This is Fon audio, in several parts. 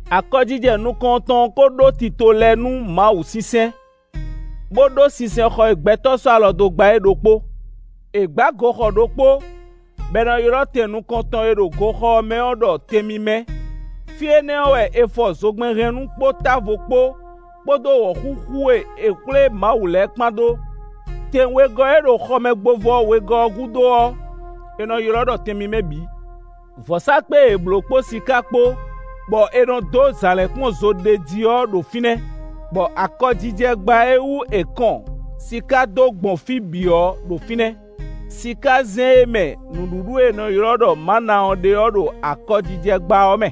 Akɔjijɛ nukɔntɔn ɔ́ ko ɖó tito lɛ́ɛ nú Mawu sinsɛn, bó ɖó sinsɛnxɔ e gbɛtɔ́ sɔ́ alɔ dó gbá é ɖokpó. È gbǎ goxɔ ɖokpó bɔ è nɔ ylɔ́ tɛn nukɔntɔn e ɖo goxɔ ɔ́ mɛ ɔ́ ɖɔ Tɛn mímɛ́. Fí énɛ́ ɔ́ wɛ è fɔ zogbɛ́nhɛnnú kpó távo kpó, kpódó wɔ̌xúxú e è xwlé Mawu lɛ́ɛ kpán ɖó. Tɛn wegɔ́ e ɖo xɔmɛgbovɔ wegɔ́ ɔ́ gúdo ɔ́, è nɔ ylɔ́ ɖɔ Tɛn mímɛ́ bǐ. Vɔ̌sákpe e è blǒ kpó siká kpó bɔ è nɔ dó zǎlínkpɔ́n zo ɖ'é jí ɔ́ ɖo fínɛ́, bɔ akɔjijɛgbá e wú è kɔn siká dó gbɔn fí bǐ ɔ́ ɖo fínɛ́. Sikázɛ́n e mɛ nǔɖuɖu e è nɔ ylɔ́ ɖɔ mǎna ɔ́ ɖe ɔ́ ɖo akɔjijɛgbá ɔ́ mɛ.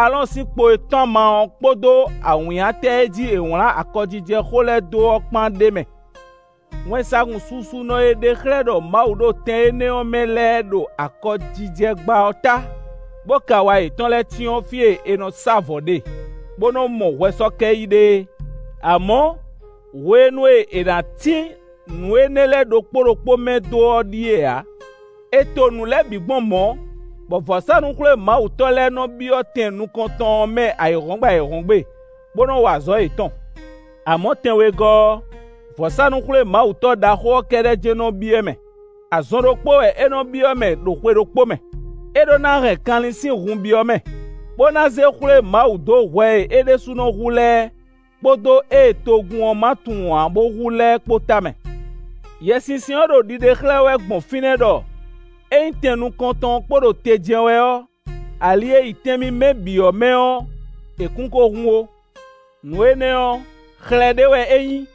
Aalɔ́ɔn sín kpo e tɔ́n ama ɔ́ kpódó awǐnnyatɛ e jí è wlǎn akɔjijɛxó lɛ́ɛ dó ɔ́ kpán ɖ'é mɛ. Wɛnsagun susunɔ e ɖe xlɛ́ ɖɔ Mawu ɖo tɛn énɛ́ ɔ́ mɛ lɛ́ɛ ɖo akɔjijɛgbá ɔ́ ta, bó kɛ awa yětɔn lɛ́ɛ cyɔ́n fí e è nɔ sá vɔ̌ ɖe, bó nɔ́ mɔ hwɛsɔ́kɛ yí ɖe é. Amɔ̌, hwenu e è nǎ tín nǔ énɛ́ lɛ́ɛ ɖokpó ɖokpó mɛ dó ɔ́ ɖíe ǎ. È to nǔ lɛ́ɛ bǐ gbɔn mɔ̌, bɔ vɔ̌sánú-xwlémawutɔ́ lɛ́ɛ nɔ byɔ́ tɛn nukɔntɔn ɔ́ mɛ ayǐhɔ́ngbe ayǐhɔ́ngbe, bó nɔ wa azɔ̌ yětɔn. Amɔ̌, tɛn wegɔ́ ɔ́, vɔ̌sánú-xwlémawutɔ́ ɖaxó ɔ́ kɛ́ɖɛ́ jɛ́n nɔ byɔ́ mɛ; azɔn ɖokpó wɛ é nɔ byɔ́ mɛ ɖo xwe ɖokpó mɛ. É ɖó ná hɛn kanlin sín hun byɔ́ mɛ, bó ná zé xwlé Mawu dó hwɛ e é ɖésúnɔ hu lɛ́ɛ kpódó ée togun ɔ́ ma tunwun ǎ bo hu lɛ́ɛ kpó tamɛ. Yɛsinsɛn ɔ́ ɖo ɖiɖe xlɛ́ wɛ gbɔn fínɛ́ ɖɔ ényí tɛn nukɔntɔn ɔ́ kpo ɖo te jɛ́n wɛ ɔ́, ali e yi Tɛn mímɛ́ bǐ ɔ́ mɛ ɔ́, è kún ko hun ó. Nǔ énɛ́ ɔ́, xlɛ́ ɖé wɛ é nyí,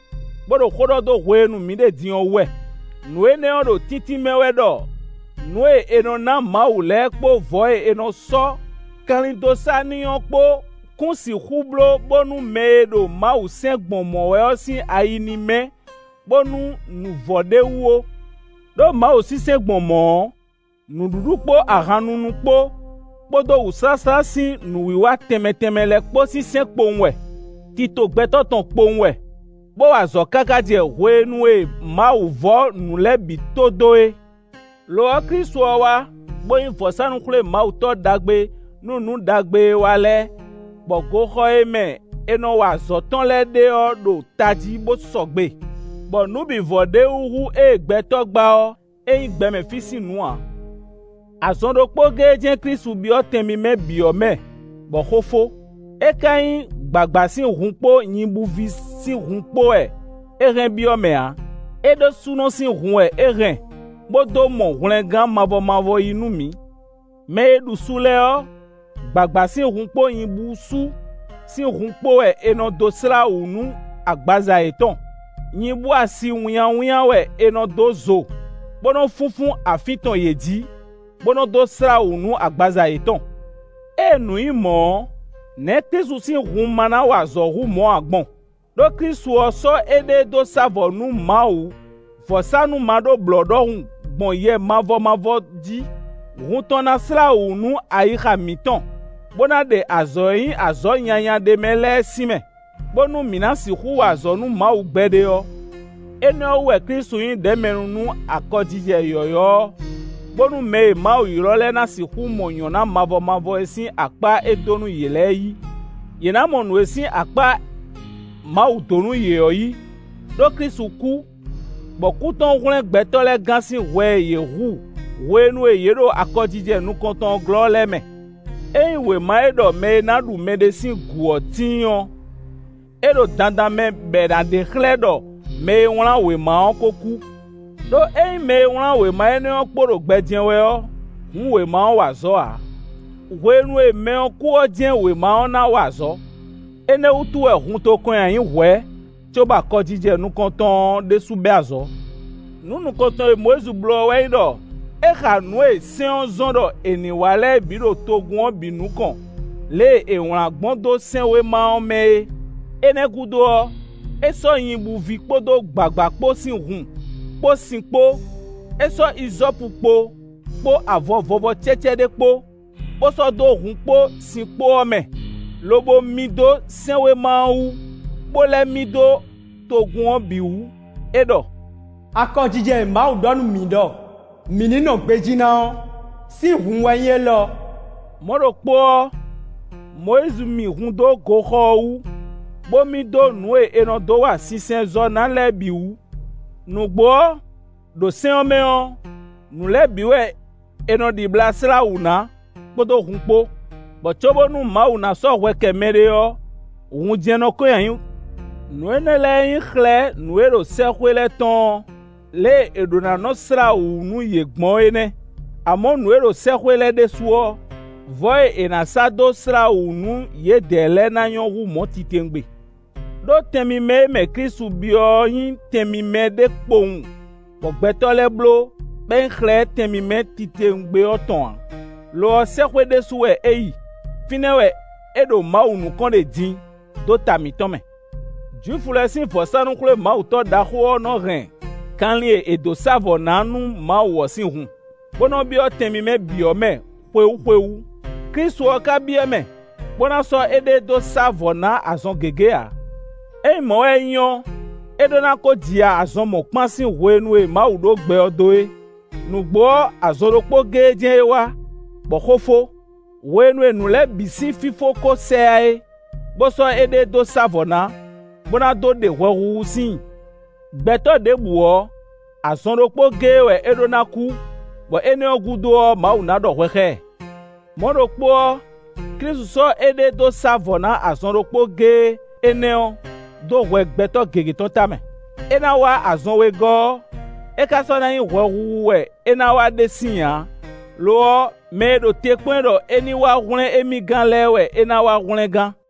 bó ɖo xó ɖɔ dó hwenu e mǐ ɖe din ɔ́ wú wɛ. Nǔ énɛ́ ɔ́ ɖo tíntín mɛ wɛ ɖɔ nǔ e è nɔ ná Mawu lɛ́ɛ kpó vɔ̌ e è nɔ sɔ́ kanlin dó sá n'i ɔ́ kpó kún sixú bló bónú mɛ e ɖo Mawu sɛn gbɔn mɔ̌ wɛ ɔ́ sín ayi ní mɛ́, bónú nǔ vɔ ɖ'é wú ó. Đó Mawu sinsɛn gbɔn mɔ̌ ɔ́, nǔɖuɖu kpó ahan nunu kpó, kpódó wǔsláslá sín nǔwiwa tɛnmɛ tɛnmɛ lɛ́ɛ kpó sín sɛ́n kpowun wɛ; tito gbɛtɔ́ tɔn kpowun wɛ, bó wa azɔ̌ káká jɛ hwenu e Mawu vɔ́ nǔ lɛ́ɛ bǐ to dó é. Lo ɔ́, Klísu ɔ́ wá, bó nyí vɔ̌sánú-xwlémawutɔ́ ɖaxó nú nǔ ɖagbe e wá lɛ́ɛ, bɔ goxɔ e mɛ é nɔ wa azɔ̌ tɔn lɛ́ɛ ɖe ɔ́ ɖo tají bó sɔgbe, bɔ nǔ bǐ vɔ ɖ'é wú hú ée gbɛtɔ́ gbá ɔ́; é nyí gbɛmɛ fí sín nǔ ǎ. Azɔn ɖokpó géé jɛ́n Klísu byɔ́ Tɛn mímɛ́ bǐ ɔ́ mɛ bɔ xó fó; é ka nyí gbǎgbá sín hun kpó nyibúví sín hun kpó wɛ é hɛn byɔ́ mɛ ǎ; é ɖésúnɔ sín hun wɛ é hɛn bó dó mɔ hwlɛngán mavɔ mavɔ yí nú mǐ. Mɛ e ɖu su lɛ́ɛ ɔ́, gbǎgbá sín hun kpó nyibúsú sín hun kpó wɛ è nɔ dó slá wǔ nú agbaza yětɔn; nyibú asi wínnyáwínnyá wɛ è nɔ dó zo, bó nɔ́ fúnfún afín tɔn yě jǐ, bó nɔ́ dó slá wǔ nú agbaza yětɔn. Ée nǔ nyí mɔ̌ ɔ́, nɛ̌ Klísu sín hun ma ná wa azɔ̌ hú mɔ̌ ǎ gbɔn? Ɖó Klísu ɔ́ sɔ́ éɖée dó sá vɔ̌ nú Mawu vɔ̌sánú maɖóblɔ̌ ɖɔhun gbɔn Yɛ mavɔ mavɔ jí; hun tɔn ná slá wǔ nú ayixa mǐtɔn, bó ná ɖe azɔ̌ e nyí azɔ̌ nyanya ɖ'é mɛ lɛ́ɛ sín mɛ, bónú mǐ ná sixú wa azɔ̌ nú Mawu gbɛɖe ɔ́. Énɛ́ ɔ́ wú wɛ Klísu nyí ɖɛ̌mɛnu nú akɔjijɛ yɔ̌yɔ́ ɔ́ bónú mɛ e Mawu ylɔ́ lɛ́ɛ ná sixú mɔ nyɔ̌ná mavɔ mavɔ e sín akpá é dó nú yě lɛ́ɛ yí. Yě ná mɔ nǔ e sín akpá Mawu dǒ nú yě ɔ́ yí, ɖó Klísu kú, bɔ kú tɔn hwlɛ́n gbɛtɔ́ lɛ́ɛ gán sín hwɛ e yě hu hwenu e yě ɖo akɔjijɛ nukɔntɔn ɔ́ glɔ́ lɛ́ɛ mɛ. Ényí wěma e ɖɔ mɛ e ná ɖu mɛɖé sín gǔ ɔ́ tíin ɔ́, é ɖo dandan mɛ bɔ è nǎ ɖe xlɛ́ ɖɔ mɛ e wlán wěma ɔ́ ko kú. Đó ényí mɛ e wlán wěma énɛ́ ɔ́ kpo ɖo gbɛ jɛ́n wɛ ɔ́, hǔn wěma ɔ́ wa azɔ̌ ǎ; hwenu e mɛ ɔ́ kú ɔ́ jɛ́n wěma ɔ́ ná wa azɔ̌. Énɛ́ wútu wɛ hun to kɔn nyi ayǐ hwɛ̌ cóbɔ akɔjijɛ nukɔntɔn ɔ́ ɖésú bɛ́ azɔ̌. Nǔ nukɔntɔn e Mɔyízi bló ɔ́ wɛ nyí ɖɔ: é xa nǔ e sɛ́n ɔ́ zɔ́n ɖɔ è ní wa lɛ́ɛ bǐ ɖo togun ɔ́ bǐ nukɔn lě e è wlǎn gbɔn dó sɛ́nwéma ɔ́ mɛ é. Énɛ́ ɔ́ gúdo ɔ́, é sɔ́ nyibúví kpódó gbǎgbá kpó sín hun, kpó sin kpó; é sɔ́ izɔ́pukpo, kpó avɔ vɔvɔ cɛ́cɛ́ ɖé kpó, bó sɔ́ dó hun kpó sin kpó ɔ́ mɛ, lobo mì dó sɛ́nwéma ɔ́ wú, bó lɛ́ mì dó togun ɔ́ bǐ wú. É ɖɔ: “Akɔjijɛ e Mawu ɖɔ nú mi ɖɔ mi ní nɔ gbejí ná ɔ́, sin hun wɛ nyí élɔ́.” Mɔ̌ ɖokpó ɔ́, Mɔyízi mì hun dó goxɔ ɔ́ wú, bó mì dó nǔ e è nɔ dó wa sinsɛnzɔ́ ná lɛ́ɛ bǐ wú. Nǔgbó ɔ́, ɖo sɛ́n ɔ́ mɛ ɔ́, nǔ lɛ́ɛ bǐ wɛ è nɔ ɖibla slá wǔ ná kpódó hun kpó, bɔ cóbónú Mawu ná sɔ́ hwɛ kɛ mɛɖé ɔ́, hun jɛ́n nɔ́ kɔn nyi ayǐ. Nǔ énɛ́ lɛ́ɛ e nyí xlɛ́ nǔ e ɖo sɛ́xwé lɛ́ɛ tɔn ɔ́, lě e è ɖǒ ná nɔ slá wǔ nú yě gbɔn é nɛ́. Amɔ̌, nǔ e ɖo sɛ́xwé lɛ́ɛ ɖésú ɔ́, vɔ̌ e è nǎ sá dó slá wǔ nú yědɛɛ lɛ́ɛ ɔ́ ná nyɔ́ hú mɔ̌ titewungbe. Đó Tɛn mímɛ́ e mɛ Klísu byɔ́ ɔ́ nyí Tɛn mímɛ́ ɖé kpowun bɔ gbɛtɔ́ lɛ́ɛ bló, bɔ é nyí xlɛ́ Tɛn mímɛ́ titewungbe ɔ́ tɔn ǎ; lo ɔ́, sɛ́xwé ɖésú wɛ é yi. Fínɛ́ wɛ é ɖo Mawu nukɔn ɖe din, dó ta mǐtɔn mɛ. Jwifu lɛ́ɛ sín vɔ̌sánú-xwlémawutɔ́ ɖaxó ɔ́ nɔ hɛn kanlin e è dǒ sá vɔ̌ ná nú Mawu ɔ́ sín hun, bó nɔ byɔ́ Tɛn mímɛ́ bǐ ɔ́ mɛ xwewú xwewú; Klísu ɔ́ ka byɔ́ mɛ, bó ná sɔ́ éɖée dó sá vɔ̌ ná azɔn gěgé ǎ. Ényí mɔ̌ wɛ é nyí ɔ́, é ɖó ná ko ji ya azɔn mɔ̌kpán sín hwenu e Mawu ɖó gbɛ ɔ́ dó é; nǔgbó ɔ́, azɔn ɖokpó géé jɛ́n é wá, bɔ xó fó, hwenu e nǔ lɛ́ɛ bǐ sín fífó ko sɛ yá é, bó sɔ́ éɖée dó sá vɔ̌ ná, bó ná dó ɖe hwɛhuhu síin. Gbɛtɔ́ ɖěbǔ ɔ́, azɔn ɖokpó géé wɛ é ɖó ná kú, bɔ énɛ́ ɔ́ gúdo ɔ́, Mawu ná ɖɔ hwɛ xá ɛ. Mɔ̌ ɖokpó ɔ́, Klísu sɔ́ éɖée dó sá vɔ̌ ná azɔn ɖokpó géé énɛ́ ɔ́ dó hwɛ gbɛtɔ́ gěgé tɔn tamɛ. É ná wá azɔn wegɔ́ ɔ́, é ka sɔ́ ná nyí hwɛhuhu wɛ é ná wá ɖe síin ǎ; lo ɔ́, mɛ e ɖo te kpɔ́n ɛ ɖɔ é ní wá hwlɛ́n émí gán lɛ́ɛ wɛ é ná wá hwlɛ́n gán.